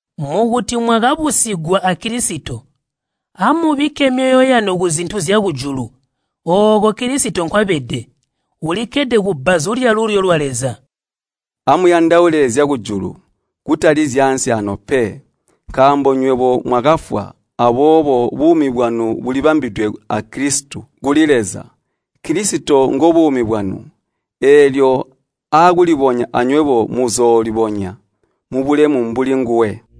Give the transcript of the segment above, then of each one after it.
Naa mwakabusigwa a Kilisito, amubikke myoyo yanu kuzintu zyakujulu, ooko Kilisito nkwabede, ulikkede kubbazu lyalulyo lwa Leza. Amuyandaule zyakujulu, kutali zyaansi aano pe. Nkaambo nywebo mwakafwa, aboobo buumi bwanu bulibambidwe a Kilisito kuli Leza. Kilisito ngobuumi bwanu, eelyo aakulibonya anywebo muzoolibonya mubulemu mbuli nguwe.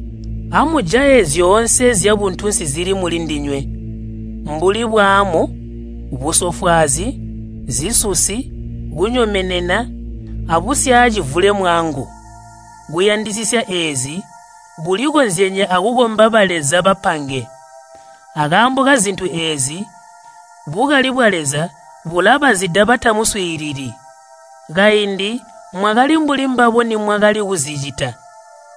Amujaye zyoonse zyabuntunsi zili mulindinywe, mbuli bwaamu, busofwaazi, zisusi, kunyomenena, abusyacivulemwangu. Kuyandisisya eezi kulikozyenye akukomba baleza bapange. Akaambo kazintu eezi, bukali bwa Leza bulabazida batamuswiilili. Kaindi mwakali mbuli mbabo nimwakali kuzicita.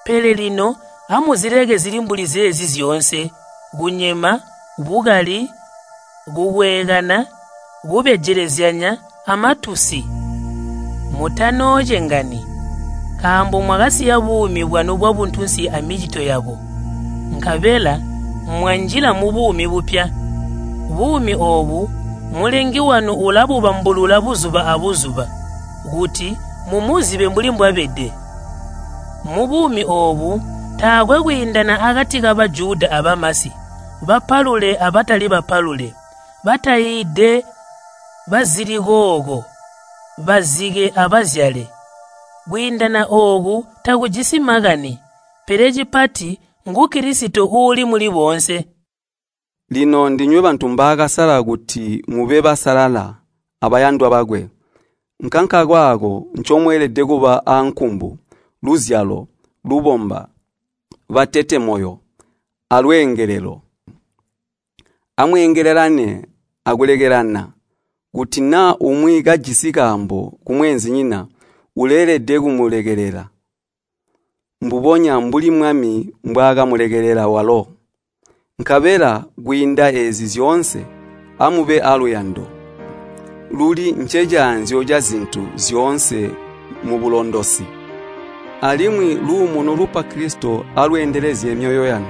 Pele lino amuzileke zili mbuli zeezi zyoonse, kunyema, bukali, kukweekana, kubejelezyanya, amatusi. Mutanoocengani, nkaambo mwakasiya buumi bwanu bwabuntunsi amicito yabo, nkabela mwanjila mubuumi bupya. Buumi oobu Mulengi wanu ulabubambulula buzuba abuzuba kuti mumuzibe mbuli mbwabede. Mubuumi oobu taakwe kwiindana akati ka Bajuda abamasi, bapalule abatali bapalule, bataiide, bazilikooko, bazike abazyale. Kwiindana ooku takujisi makani, pele cipati ngu Kilisito uuli muli boonse. Lino ndinywe bantu mbaakasala kuti mube basalala abayandwa bakwe. Nkankakaako ncomweelede kuba aankumbu, luzalo, lubomba, batete moyo, alweengelelo. Amweengelelane akulekelelana. Kuti naa umwi kajisi kaambo kumweenzinyina uleelede kumulekelela mbubonya mbuli Mwami mbwaakamulekelela walo. Nkabela kwiinda eezi zyoonse, amube aaluyando, luli ncecaanzyo cazintu zyoonse mubulondosi. Alimwi luumuno lupa Kilisito alweendelezye myoyo yanu.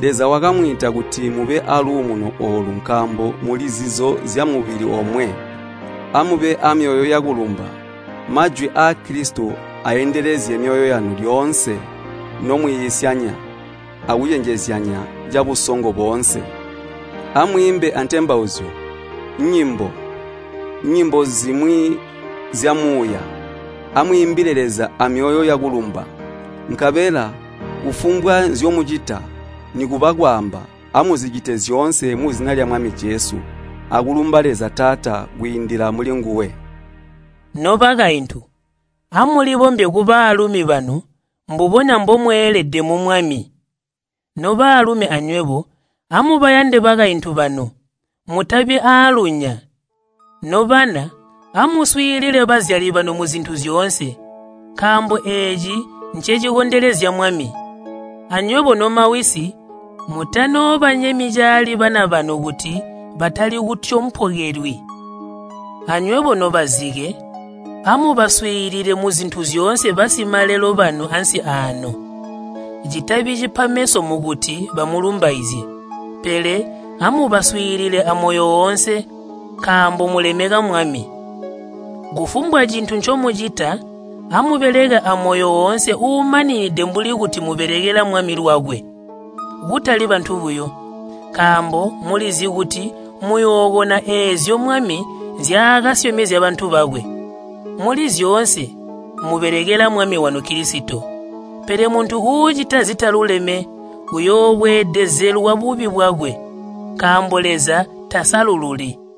Leza wakamwiita kuti mube aaluumuno oolu nkaambo muli zizo zyamubili omwe. Amube amyoyo yakulumba. Majwi aa Kilisito aaendelezye myoyo yanu lyoonse nomwiisyanya akucenjezyanya cabusongo boonse. Amwiimbe antembauzyo, nyimbo, nyimbo zimwi zyamuuya, amwiimbile Leza amyoyo yakulumba. Nkabela kufumbwa nzyomucita, nikuba kwaamba, amuzicite zyoonse muzina lya Mwami Jesu, akulumba Leza Taata kwiindila mulinguwe. Nobakaintu, amulibombye kubalumi banu mbubonya mbomweelede mu Mwami. Nobalumi anywebo, amuyande bakaintu banu, mutabi aalunya. Nobana, amuswiilile bazyali banu muzintu zyoonse, nkaambo eeci ncecikondelezya Mwami. Anywebo nomawisi, mutanoobanyemyi caali bana banu kuti batali kutyompokelwi. Anywebo nobazike, amubaswiilile muzintu zyoonse basimalelo banu ansi aano. Citabi cipa meso mukuti bamulumbaizye, pele amubaswiilile amoyo oonse, nkaambo mulemeka Mwami. Kufumbwa cintu ncomucita, amubeleke amoyo woonse uumaninide mbuli kuti mubelekela Mwami lwakwe, kutali bantu buyo. Nkaambo mulizi kuti muyookona eezyo Mwami nzyaakasyomezya bantu bakwe. Muli zyoonse mubelekela Mwami wanu Kilisito. Pele muntu uucita zitaluleme, uuyoobweedezelwa bubi bwakwe, nkaambo Leza tasalululi.